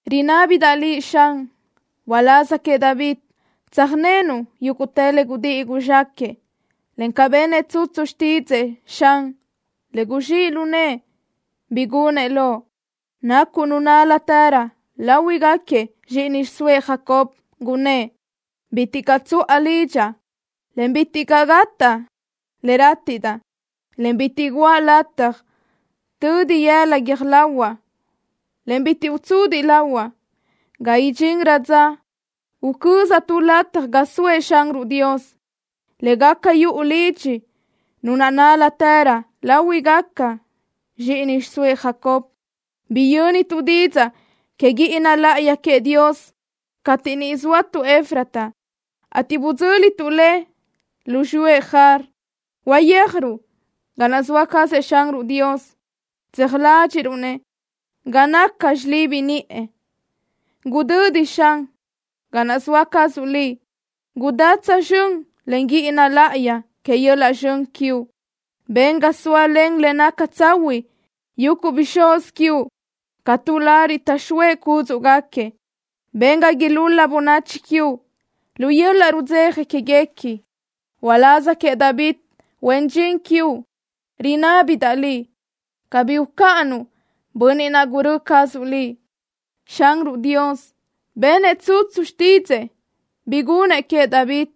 Rinábidaʼ Liʼ, Xan, uláz queëʼ David tsöjnénuʼ yúguʼtë le gudíʼi guzxáquëʼë, en ca benëʼ tsutsu xtídzëʼë, Xan, en guzxíʼ lu nëʼë bi gunëʼ loʼ, nacuʼ Nu nál-latërö láhuigaquiëʼ zxíʼini xiʼsóëʼ Jacob, gunnë́ʼ: “Bitiʼ caʼ tsuʼa lidxaʼ, en bitiʼ gátaʼa le rátiʼdaʼ, en bitiʼ guʼa lataj tödi yëla guiö́j lahuaʼ, en bitiʼ utsudiʼ lahuaʼ, ga idxinrö dza ucözaʼ tu lataj ga soëʼ Xanruʼ Dios, le gaca yuʼu lidxi Nu naʼ nál-latërö láhuigaquiëʼ zxíʼini xiʼsóëʼ Jacob.” Biyö́nituʼ didzaʼ que guíʼina láʼayi queëʼ Dios cateʼ niʼ zóatuʼ Efrata, ateʼ budzö́lituʼ le lu xiyúëʼ Jaar. Uyéajruʼ ga naʼ zoa cazëʼ Xanruʼ Dios. Tseaj ládxiʼruʼ-nëʼ ga naca xilibi niʼë. Gudödi, Xan, ga naʼ soa cazuʼ Liʼ. Gudá tsözxö́n len guíʼina láʼayi que yöl-laʼ zxön quiuʼ. Ben ga sóalen le naca tsahuiʼ yuguʼ bixúz quiuʼ ca tu lariʼ taʼxóëʼ cúdzuʼgaquiëʼ. Ben ga ilúl-la bönachi quiuʼ lu yöl-laʼ rudzeja quéguequi. Uláz queëʼ David, huen dxin quiuʼ, rinábidaʼ Liʼ cabí ucáʼanuʼ bönniʼ naʼ gurö́ cazuʼ Liʼ. Xanruʼ Dios benëʼ tsutsu xtídzëʼë bi gunëʼ queëʼ David,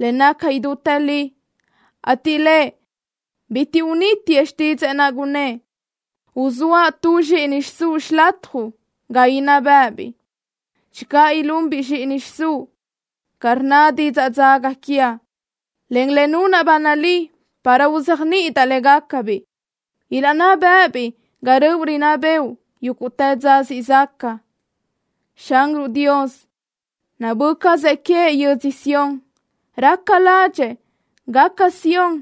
le naca idútë li, ateʼ Lëʼ bitiʼ unítiëʼ xtídzëʼë naʼ, gunnë́ʼ: “Uzóaʼ tuëʼ zxíʼini xiʼsúʼ xilatjuʼ ga inná bë́ʼëbiʼ. Channö ilunbiʼ zxíʼini xiʼsúʼ ca rnna didzaʼ dzaga quiaʼ, en le nunaʼ ba nalí para uzéajniʼidaʼ légacabiʼ, ilaʼnná bë́ʼëbiʼ ga röʼu rinná bëʼu yúguʼtë dza siʼ zaca.” Xanruʼ Dios nabö́ cazëʼ queëʼ yödzö Sión. Raca ládxëʼë gaca Sión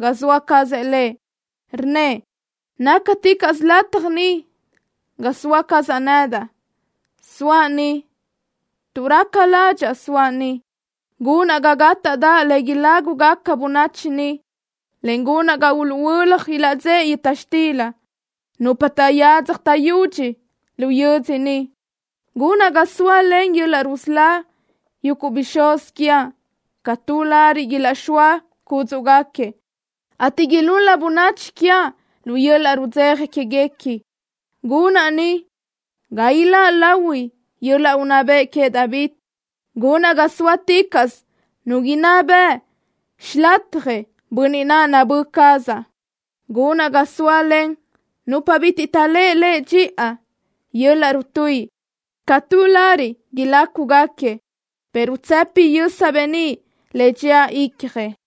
ga soa cazëʼ Lëʼ. Rnnëʼ: “Nácaticaʼsö lataj ni ga soa cazaʼ nedaʼ. Soaʼ ni tuʼ raca ládxaʼa soaʼ ni. Gunaʼ ga gátadaʼ le ilágugaca bönachi ni, en gunaʼ ga uluʼhuö́laj ilaʼdzéʼe yöta xtila nupa taʼyadzaj taʼyudxi lu yödzö ni. Gunaʼ ga sóalen yöl-laʼ rusölá yuguʼ bixúz quiaʼ ca tu lariʼ ilaʼxóa cúdzuʼgaquiëʼ, ateʼ ilúl-la bönachi quiaʼ lu yöl-laʼ rudzeja quéguequi. Gunaʼ ni ga iláʼ lahui yöl-laʼ unná bëʼ queëʼ David. Gunaʼ ga sóaticaʼsö nu inná bëʼ xilatjëʼ bönniʼ naʼ nabö́ cazaʼ. Gunaʼ ga sóalen nupa bitiʼ taʼléʼe lëʼ dxiʼa yöl-laʼ rutuíʼi ca tu lariʼ ilácuguequi, pero tsëpi yösa beníʼ le dxía icjëʼ.”